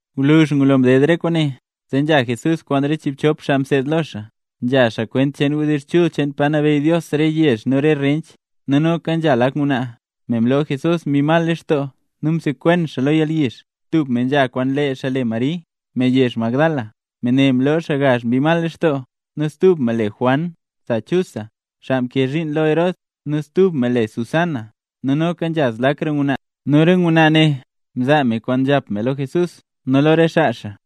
Gwluzh ngulo mded re kwaane, zee nzha Jesús kwaan re chiibchop xaa mseed lo xaa, nzhazaa xaa kwent cheen wdizh chul cheen pa nabeyy Dios re yezh nu re rench. Nu noka nzha lak ngwnaa, me mloo Jesús mbi mal lextoo nu me msekwen xaa lo yalyizh. Tub me nzha kwaan lee xaa le Mari, me yezh Magdala, me ne mloo xaa gazh mbi mal lextoo; nu stub me le Juan sa Chusa, xaa mkee zhiin lo Herod; nu stub me le Susana, nu noka nzha zlakra ngwnaa. Nu re ngwnaa ne mzaa me kwaana nkano me lo Jesús nu lo re xaa xaa.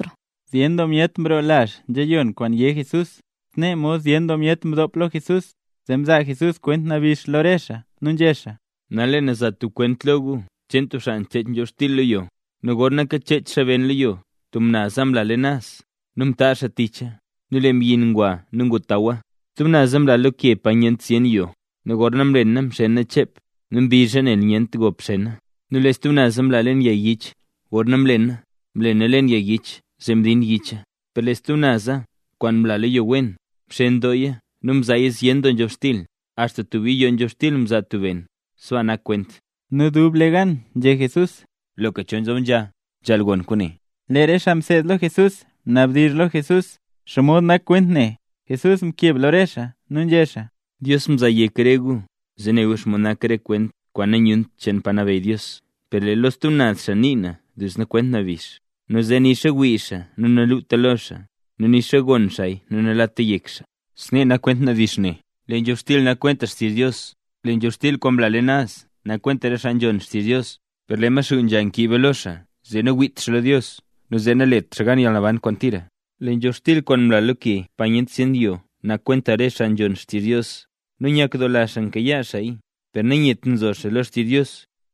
Zyen doo myet mroo lazh yiyon kwaan yé Jesús, snee mod zyen doo myet mdop lo Jesús, zee mzaa Jesús kwent nabix lo re xaa nu nzhé xaa: —Nal lee na za tub kwent lo gu cheen tub xaa nchech nzhobxtil lo yo. Nu gorna kachech xaa ben lo yo tub naza mla leen naz, nu mtaazh xaa ticha, nu lee mbyin ngwa nu ngutawa. Stub naza mla lo ke pa nyent zyen yo; nu gorna mlena mxena chep, nu mbizha nel nyent gop xena. Nu lee stub naza mla leen yag yich; gorna mlena, mlena leen yag yich zee mdin yicha. Per lee stub naza kwaan mla lo yo wen, mxen dooya nu mzaaya zyen doo nzhobxtil, axta tub yiyoo nzhobxtil mzaa tub ben. Sbaa nak kwent. Nu dublegan nzhé Jesús: —¡Loka cho nzob nzha, nzhaal gon kwaane! Lee re xaa mseed lo Jesús mnabdizh lo Jesús: —¿Xomod nak kwent ne? Jesús mkeb lo re xaa nu nzhé xaa: —Dios mzaa yek re gu zee ne gu xomod nak re kwaan nanyunt cheen pa nabeyy Dios; per lee lo stub naz xaa nii na duzna kwent nabix, nu zee nixa wii xaa nu naluta lo xaa, nu nixa gon xaaya nu nalata yek xaa. ’Snee nak kwent nabix ne: Lee nzhobxtil nak kwenta xtizh Dios. Lee nzhobxtil kwaan mla leen naz nak kwenta re xaa nzhon xtizh Dios, per lee Maxuu nzha nkiiba lo xaa zee nawiit xaa lo Dios nu zee nalet xaa gan yalnaban kwaan tira. Lee nzhobxtil kwaan mla lo ke pa nyent zyen yo nak kwenta re xaa nzhon xtizh Dios, nu nyakdoola xaa mkayaa xaaya, per nanyet nzo xaa lo xtizh Dios;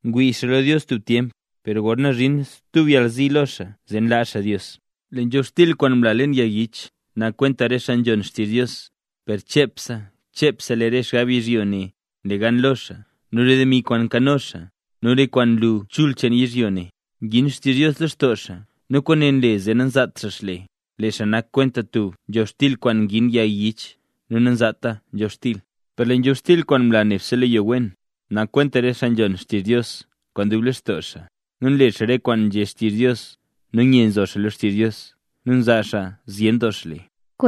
ngwii xaa lo Dios tub tyemp, per gorna nzhin tub yalzi lo xaa zee nlaa xaa Dios. Lee nzhobxtil kwaan mla leen yag yich nak kwenta re xaa nzhon xtizh Dios, per chepse chepse lee re xgab yizhyo ne nle gan lo xaa nu re demi kwaan nkano xaa nu re kwaan nlu chul cheen yizhyo ne, ngin xtizh Dios lextoo xaa nu kwaane nle zee nanzaat xaa xle. Lee xaa nak kwenta tub nzhobxtil kwaan ngin yag yich nu nanzaata nzhobxtil. Per lee nzhobxtil kwaan mla neb lo yo wen, nak kwenta re xaa nzhon xtizh Dios kwaan dub lextoo xaa, nu nle xaa re kwaan nzhé xtizh Dios, nu nye nzo xaa lo xtizh Dios, nu xaa ne nzaa zyen doo xle.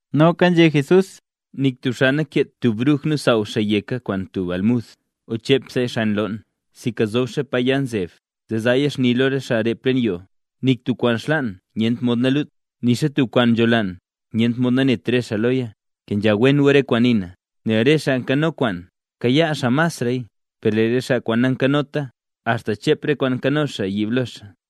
Noka nzhé Jesús: —Nik tub xaa nankeet tub bruj nu nsaaw xaa yeka kwaan tub almud o chep xaaya xan loon, sinka nzob xaaya pa ya nzeb, zee zaaya xni lo re xaa rep leen yoo. Nik tub kwaan xlaan nyent mod nalut, nixa tub kwaan nzholaan nyent mod nanet re xaa loya. ’Kenzha wen gu re kwaan nii na. Nel re xaa nkano kwaan, kayaa xaa masraya; per lee re xaa nankanota axta chep re kwaan nkano xaa yiib lo xaa.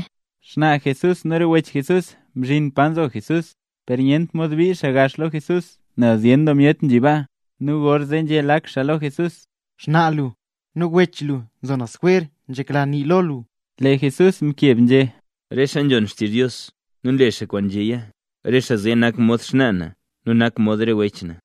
Xnaa Jesús nu re wech Jesús mzhin pa nzo Jesús, per nyent mod bii xaa gax lo Jesús nel zyen doo myet nzhi baa. Nu gorzee nzhé lak xaa lo Jesús: —Xnaa lu nu re wech lu nzo naz jwer, nzhekla re xaa nii xaa lo lu. Lee Jesús mkeb nzhé: —Re xaa nzhon xtizh Dios nu nle kwaan nzhéya, re xaa zee nak mod xnaa na nu mod re wech na.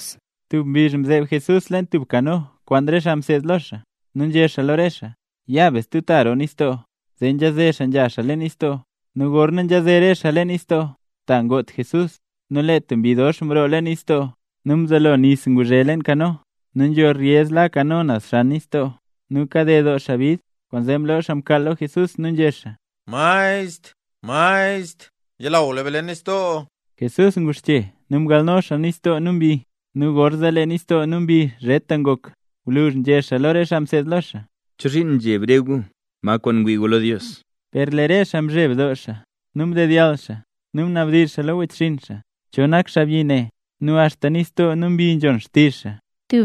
Tub mbizh Jesús mzeeb leen tub kano kwaan re xaa mseed lo xaa, nu nzhé xaa lo re xaa: —Ya be stub ta roo nistoo. Zee nzhaze xaa nzha xaa leen nistoo. Nu gorna nzhaze re xaa leen nistoo, ta ngot Jesús. Nu lee tub mbi dox doo mroo leen nistoo, nu mzelo nis nguzhe leen kano, nu nzho reyez la kano naz xan nistoo, nu kaded doo xaa bid. Kwaanzee mloo xaa mkaal lo Jesús nu nzhé xaa: —¡Maestr! ¡Maestr! ¡Nzhalaw be leen nistoo! Jesús nguxche nu mgalno nistoo nu mbi, nu gorzee lee nistoo nu mbi zheta ngok. Gwluzh nzhé xaa lo re xaa mseed lo xaa: —¿Chozhiin nzheb re gu? ¿Ma kwaan ngwii gu lo Dios? Per lee re xaa mzheb doo nu mdedyall xaa, nu mnabdizh xaa lo wechxinn xaa: —¿Cho nak xaabyi ne, nu axta nistoo nu mbi nzhon xtizh xaa?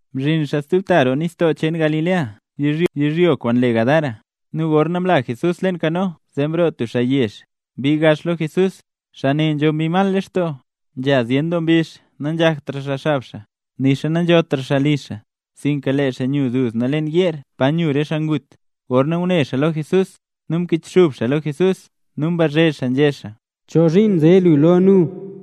Mzhin xaa stub ta roo nistoo cheen Galilea yizhyo kwaan le Gadara. Nu gorna mla Jesús leen kano zee mroo tub xaa yezh, mbii gax lo Jesús. Xaa ne nzho mbi mal lextoo. Nzha zyen doo mbizh nanzhaktra xaa xab xaa, nixa nanzhotra xaa li xaa, sinka lee xaa nyu duzna leen yeer pa nyu re xaa ngut. Gorna ngune xaa lo Jesús, nu mkichxub xaa lo Jesús nu mbazhe xaa nzhé xaa: —¿Chozhiin nze lu lo nu,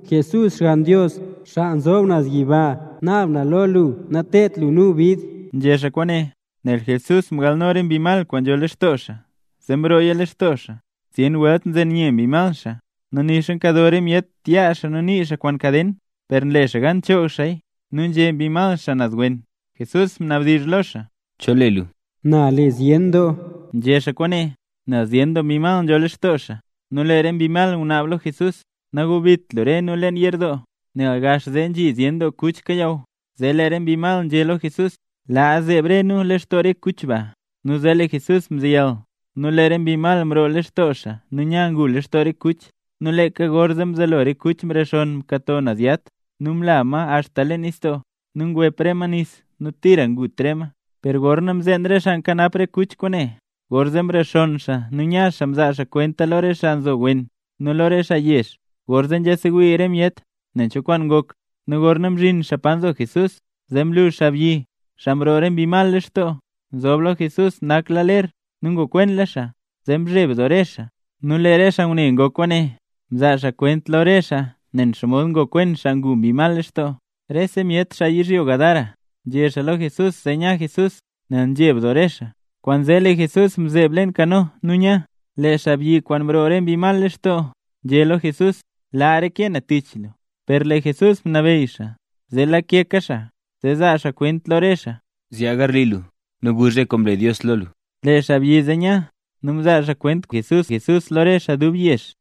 Jesús Xgann Dios, xaa nzob naz yiba? ¡Naab na lo lu nateedt lu nu bid! Nzhé xaa kwaane, nel Jesús mgalno re mbi mal kwaan nzho lextoo xaa, zee mrooya lextoo xaa. (Zyen welt nzen nye mbi mal xaa. Nu nixa nkado re myet yaa xaa nu nii xaa kwaan kaden, per nle xaa gan nchoog xaaya nu nzhe mbi mal xaa naz wen.) Jesús mnabdizh lo xaa: —¿Cho le lu? Nu lee xaa mkeb nzhé: —Na le Zyen Doo. Nzhé xaa kwaane, nel zyen doo mbi mal nzho lextoo xaa. Nu lee re mbi mal ngunaab lo Jesús: —Nagubit lu re nu leen yerdoo. Nel gax zee nzhi zyen doo kuch kayaw, zee lee re mbi mal nzhé lo Jesús: —Laa zeeb re nu lextoo re kuch ba. Nu zee lee Jesús mzeyal. Nu lee re mbi mal mroo lextoo xaa nu nya ngu lextoo re kuch. Nu leeka gorzee mzelo re kuch mrexonn nkato naz yat nu mla axta leen nistoo. Nu ngwep re ma nis nu tira ngut re ma. Per gorna mzeen re xaa nkanap re kuch kwaane, gorzee mrexonn xaa nu nya xaa mzaa xaa kwenta lo re xaa nzo wen nu lo re xaa yezh. Gorzee nzhasewii re myet nen cho kwaan ngok. Nu gorna mzhin xaa pa nzo Jesús, zee mlu xaabyi, xaa mroo re mbi mal lextoo, nzob lo Jesús, nakla xaa ler nu ngokwenla xaa, zee mzheb doo re xaa. Nu lee re xaa ngune ngok kwaane mzaa kwent lo re xaa nen xomod ngokwen xaa ngu mbi mal lextoo. Rese myet, xaa yizhyo Gadara, nzhé lo Jesús zee nya Jesús, nel nzheb doo re xaa. Kwaanzee lee Jesús mzeeb leen kano nu nya. Lee xaabyi kwaan mroo re mbi mal lextoo nzhé lo Jesús: —Laa reke na tich lu. Per Jesús mnabeyy xaa, zee lake xaa zee zaa xaa kwent lo re xaa: —Zyaa garli lu, nu guzh re kwaan mle Dios lo lu. Lee xaabyi zee nya, nu mzaa xaa kwent kwaan mle Jesús lo rese xaa dub yezh.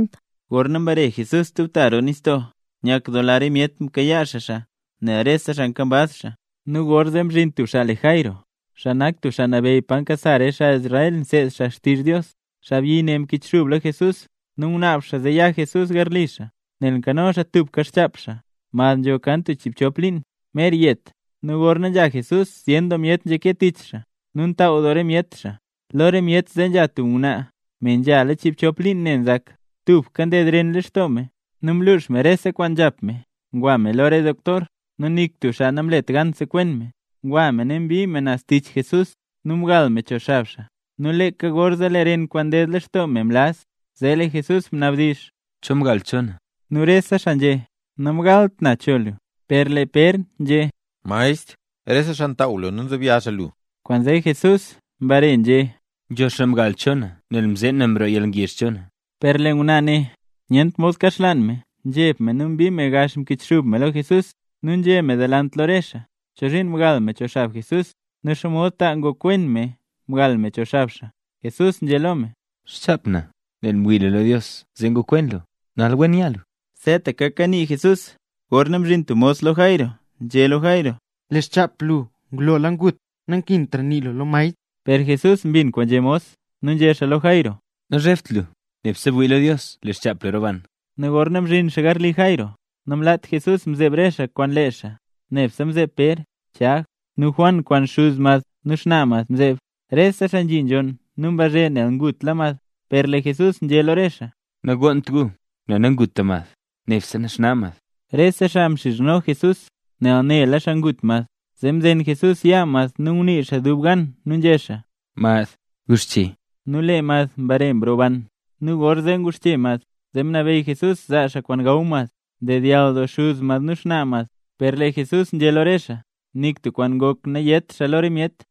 Gorna mbare Jesús stub ta roo nistoo, nyakdoola re myet mkayaa xaa xaa, nel rese xaa nkambaz xaa. Nu gorzee mzhin tub xaa le Jairo, xaa nak tub xaa nabeyy pa nkasa re xaa Israel nseed xaa xtizh Dios. Xaabyi ne mkichxub lo Jesús nu ngunaab xaa zee ya Jesús garli xaa, nel nkano xaa tubka xchap xaa, mad nzho kan tub chiibchop liin, mer yet. Nu gorna nzha Jesús zyen doo myet nzhake tich xaa nu ntaaw doo re myet xaa. Lo re myet zee nzha tub ngwnaa, me nzhala chiibchop liin ne nzak. Tubka nded ren lextoo me. Nu mlux me rese kwaan nzhap me ngwa me lo re doktor, nu nik tub xaa namlet gan sekwen me. Ngwnaa ne mbii naz tich Jesús, nu mgal me cho xab xaa. Nu leeka gorzee lee ren kwaan ded lextoo me mlaz. Zee lee Jesús mnabdizh: —¿Cho mgal cho na? Nu rese xaa nzhé: —Namgalt na cho lu. Per lee Pér nzhé: —Maestr, rese xaa ntaaw lu nu nzobya lu. Kwaanzee Jesús mbare nzhé: —Nzho tub myet mgal cho na, nel mzeen na mroo yalngezh cho na. Per lee ngwnaa ne nyent mod kaxlaan me nzheb me nu mbii me gax mkichxub me lo Jesús. Nu nzhé me delant lo re xaa, cho zhiin mgal me cho xab Jesús, nu xomod ta ngokwen me mgal me cho xab xaa. Jesús nzhé lo me: —Xchap na. Nel mwii lu lo Dios, zee ngokwen lu. Nal wen nya lu. Seetaka kanii Jesús gorna mzhin tub mos lo Jairo nzhé lo Jairo: —Lee xchap lu ngulola ngut, nankintra nii lu lo maestr. Per Jesús mbin kwaan nzhé mos nu nzhé xaa lo Jairo: —Nazhebt lu. Nebse wii lu lo Dios, lee xchap lu roban. Nu gorna mzhin xaa garli Jairo, namlaat Jesús mzeeb re xaa kwaan lee xaa, nebse mzeeb Pér, Chag, nu Juan kwaan xuz mad nu xnaa mad mzeeb. Rese xaa nzhi nzhonn nu mbazhe nel ngutla mad, per lee Jesús nzhé lo re xaa: —Nagonnt gu nel nanguta mad, nebse naxna mad. Rese xaa mxizhno Jesús, nel nela xaa ngut mad. Zee mzen Jesús yaa mad nu ngunii xaa dub gan nu nzhé xaa: —¡Mad, guxche! Nu lee mad mbare mroban. Nu gorzee nguxche mad, zee mnabeyy Jesús zaa xaa kwaan gaw mad. Mdedyall doo xuz mad nu xnaa mad. Per lee Jesús nzhé lo re xaa nik tub kwaan ngok nayét xaa lo re myet.